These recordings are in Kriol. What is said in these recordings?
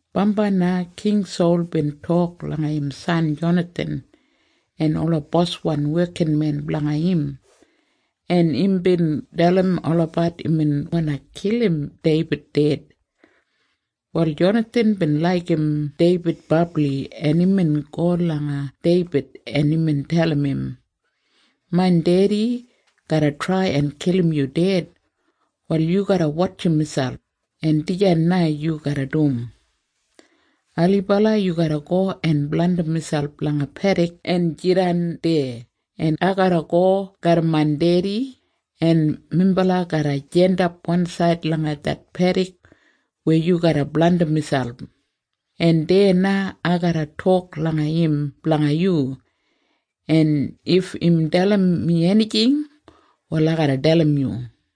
Bambai na King Sol bin tok langa im san Jonathan en ola boswan wekinmen blanga im, en imbin dalim olabat imbin wandi kilim Deibid ded. Wal Jonathan bin laigim Deibid brabli, en imbin go langa Deibid, en imbin dalim im, “Main dedi garra trai en kilim yu ded. Wal yu garra wotjim miselp, en dijan na yu garra dum. Ailibala yu garra go en blandim miselp langa pedik en jidan deya, en ai garra go garram main dedi, en minbala garra jandap wansaid langa det pedik weya yu garra blandim miselp, en deya na ai garra tok langa im blanga yu, en if im dalim mi enijing, wal ai garra dalim yu.”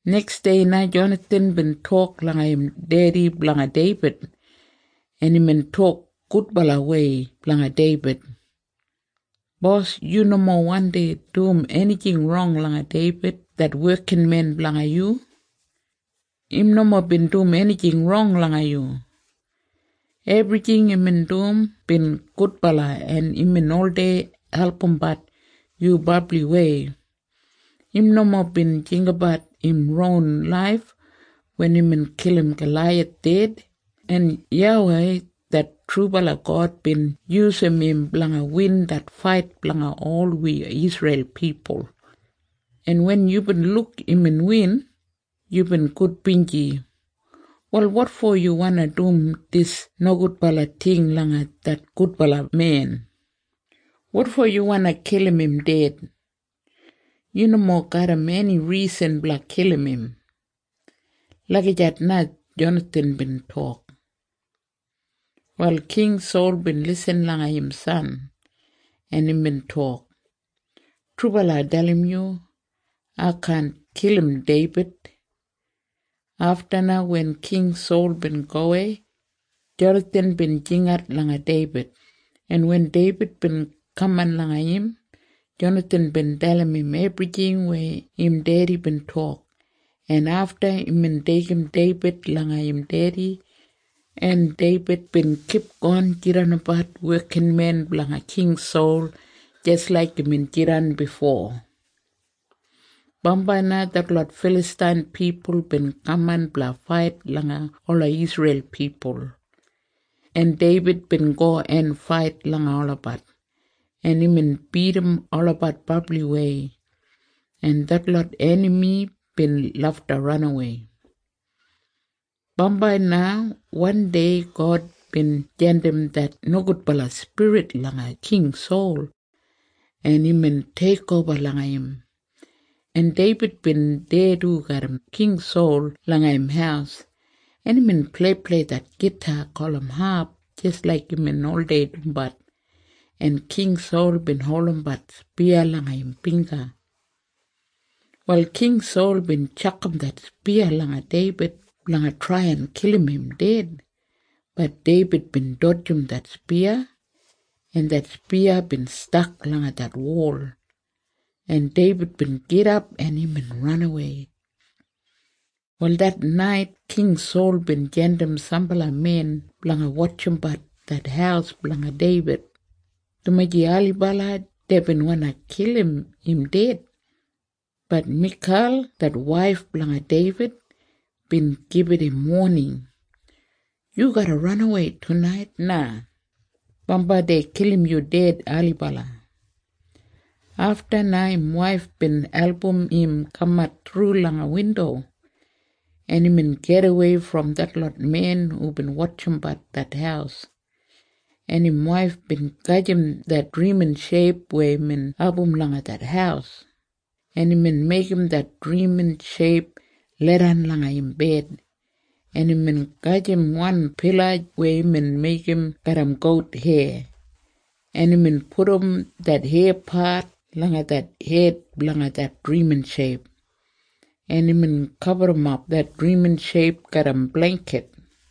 Neksdei na Jonathan bin tok langa im dedi blanga Deibid, en imbin tok gudbalawei blanga Deibid, “Bos, yu nomo wandi dum enijing rong langa Deibid det wekinmen blanga yu. Im nomo bin dum enijing rong langa yu. Ebrijing imbin dum bin gudbala, en imbin oldei albumbat yu brabliwei. Im nomo bin jinggabat im ron laif wen imbin kilim Galaiyath ded, en YAWEI det trubala God bin yusum im blanga win det fait blanga ol wi Isreil pipul, en wen yubin luk imbin win, yubin gudbinji. Wal wotfo yu wandi dum dis nogudbala ting langa det gudbala men? Wotfo yu wandi kilim im ded? Yu nomo garram eni risan blanga kilim im.” Lagijat na Jonathan bin tok. Wal King Sol bin lisin langa im san, en imbin tok, “Trubala ai dalim yu. Ai kaan kilim Deibid.” Afta na wen King Sol bin gowei, Jonathan bin jingat langa Deibid, en wen Deibid bin kaman langa im, Jonathan bin dalim im ebrijing weya im dedi bin tok, en afta imbin deigim Deibid langa im dedi, en Deibid bin kipgon jidanbat wekinmen blanga King Sol jis laik imbin jidan bifo. Bambai na detlot Filastain pipul bin kaman blanga fait langa ola Isreil pipul, en Deibid bin go en fait langa olabat, en imbin bidim olabat brabliwei, en detlot enami bin lafta ranawei. Bambai na wandei God bin jandim det nogudbala spirit langa King Sol, en imbin teikoba langa im, en Deibid bin deya du garram King Sol langa im haus, en imbin pleiplei det gita gulum hap jis laik imbin oldei dumbat, en King Sol bin holdimbat spiya langa im bingga. Wal King Sol bin tjakam det spiya langa Deibid blanga trai en kilim im ded. Bat Deibid bin dodjim det spiya, en det spiya bin stak langa det wol, en Deibid bin gidap, en imbin ranawei. Wal det nait King Sol bin jandim sambala men blanga wotjimbat det haus blanga Deibid, dumaji ailibala deibin wandi kilim im ded. Bat Mikal det waif blanga Deibid bin gibit im woning, “Yu garra ranawei tunait na. Bambai dei kilim yu ded ailibala.” Afta na im waif bin album im kamat thru langa windo, en imbin gidawei brom detlot men hubin wotjimbat det haus, en im waif bin gajim det drimin sheip weya imbin abum langa det haus, en imbin meigim det drimin sheip leidan langa im bed, en imbin gajim wan pila weya imbin meigim garram gout heya, en imbin pudum det heyapat langa det hed blanga det drimin sheip, en imbin gaburrumap det drimin sheip garram bleingkit.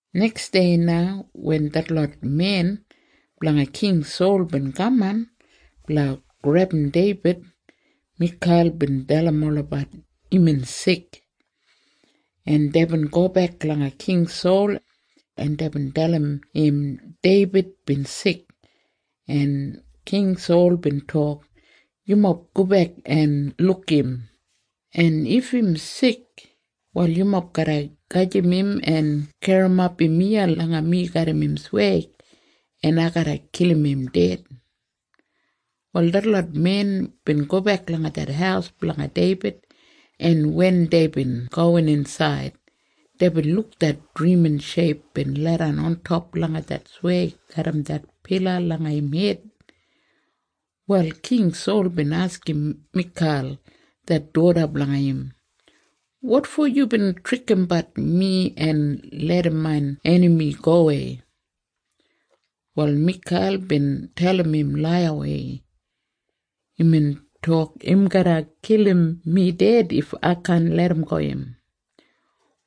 Neksdei na wen detlot men blanga King Sol bin kaman blanga grebum Deibid, Mikal bin dalim olabat imbin sik, en deibin gobek langa King Sol, en deibin dalim im Deibid bin sik, en King Sol bin tok, “Yumob gobek en luk im, en if im sik, wal yumob garra gajim im en garrimap im iya langa mi garram im sweig, en ai garra kilim im ded.” Wal detlot men bin gobek langa det haus blanga Deibid, en wen deibin gowin insaid, deibin luk det drimin sheip bin leidan ontop langa det sweig garram det pila langa im hed. Wal King Sol bin askim Mikal det doda blanga im, “Wotfo yubin trikimbat mi en larram main enami gowei?” Wal Mikal bin dalim im laiyawei, “Imbin tok im garra kilim mi ded if ai kaan larramgo im.”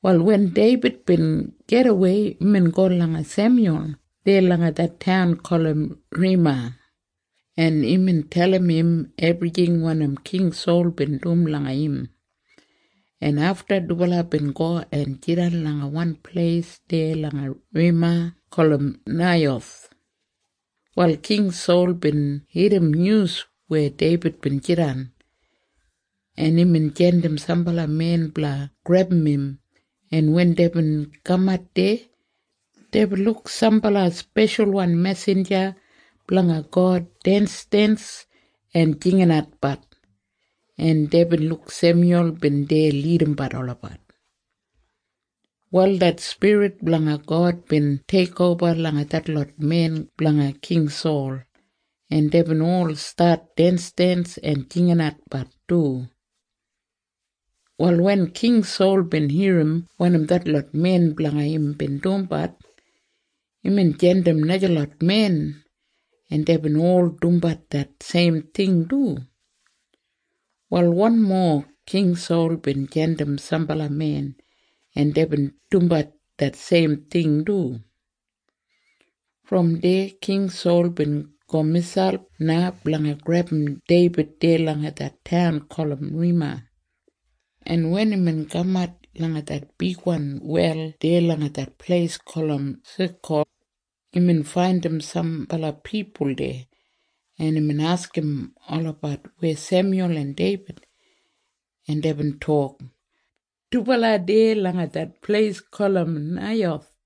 Wal wen Deibid bin gidawei, imbin go langa Semyul deya langa det taun gulum Rema, en imbin dalim im ebrijing wanim King Sol bin dum langa im, en afta dubala bin go en jidan langa wan pleis deya langa Rema gulum Naiyoth. Wal King Sol bin irrim nyus weya Deibid bin jidan, en imbin jandim sambala men blanga grebum im, en wen deibin kamat deya, deibin luk sambala speshalwan mesinja blanga God densdens en jinginatbat, en deibin luk Semyul bin deya lidimbat olabat. Wal det Spirit blanga God bin teikoba langa detlot men blanga King Sol, en deibin ol stat densdens en jinginatbat du. Wal wen King Sol bin irrim wanim detlot men blanga im bin dumbat, imbin jandim najalot men, en deibin ol dumbat det seim ting du. Wal wanmo King Sol bin jandim sambala men, en deibin dumbat det seim ting du. Brom deya King Sol bin go miselp na blanga grebum Deibid deya langa det taun gulum Rema, en wen imbin kamat langa det bigwan wel deya langa det pleis gulum Seku, imbin faindim sambala pipul deya, en imbin askim olabat weya Semyul en Deibid, en deibin tok, “Dubala deya langa det pleis gulum Naiyoth.”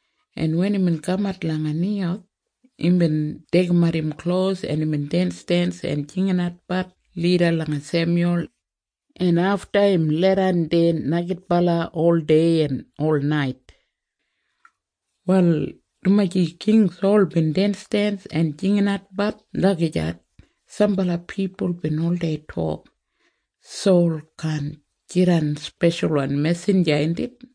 en wen imbin kamat langa Naiyoth, imbin deigimat im klos, en imbin densdens en jinginatbat lida langa Semyul, en afta im leidan deya neigidbala oldei en olnait. Wal dumaji King Sol bin densdens en jinginatbat lagijat, sambala pipul bin oldei tok, “Sol kaan jidan speshalwan mesinja, indit?”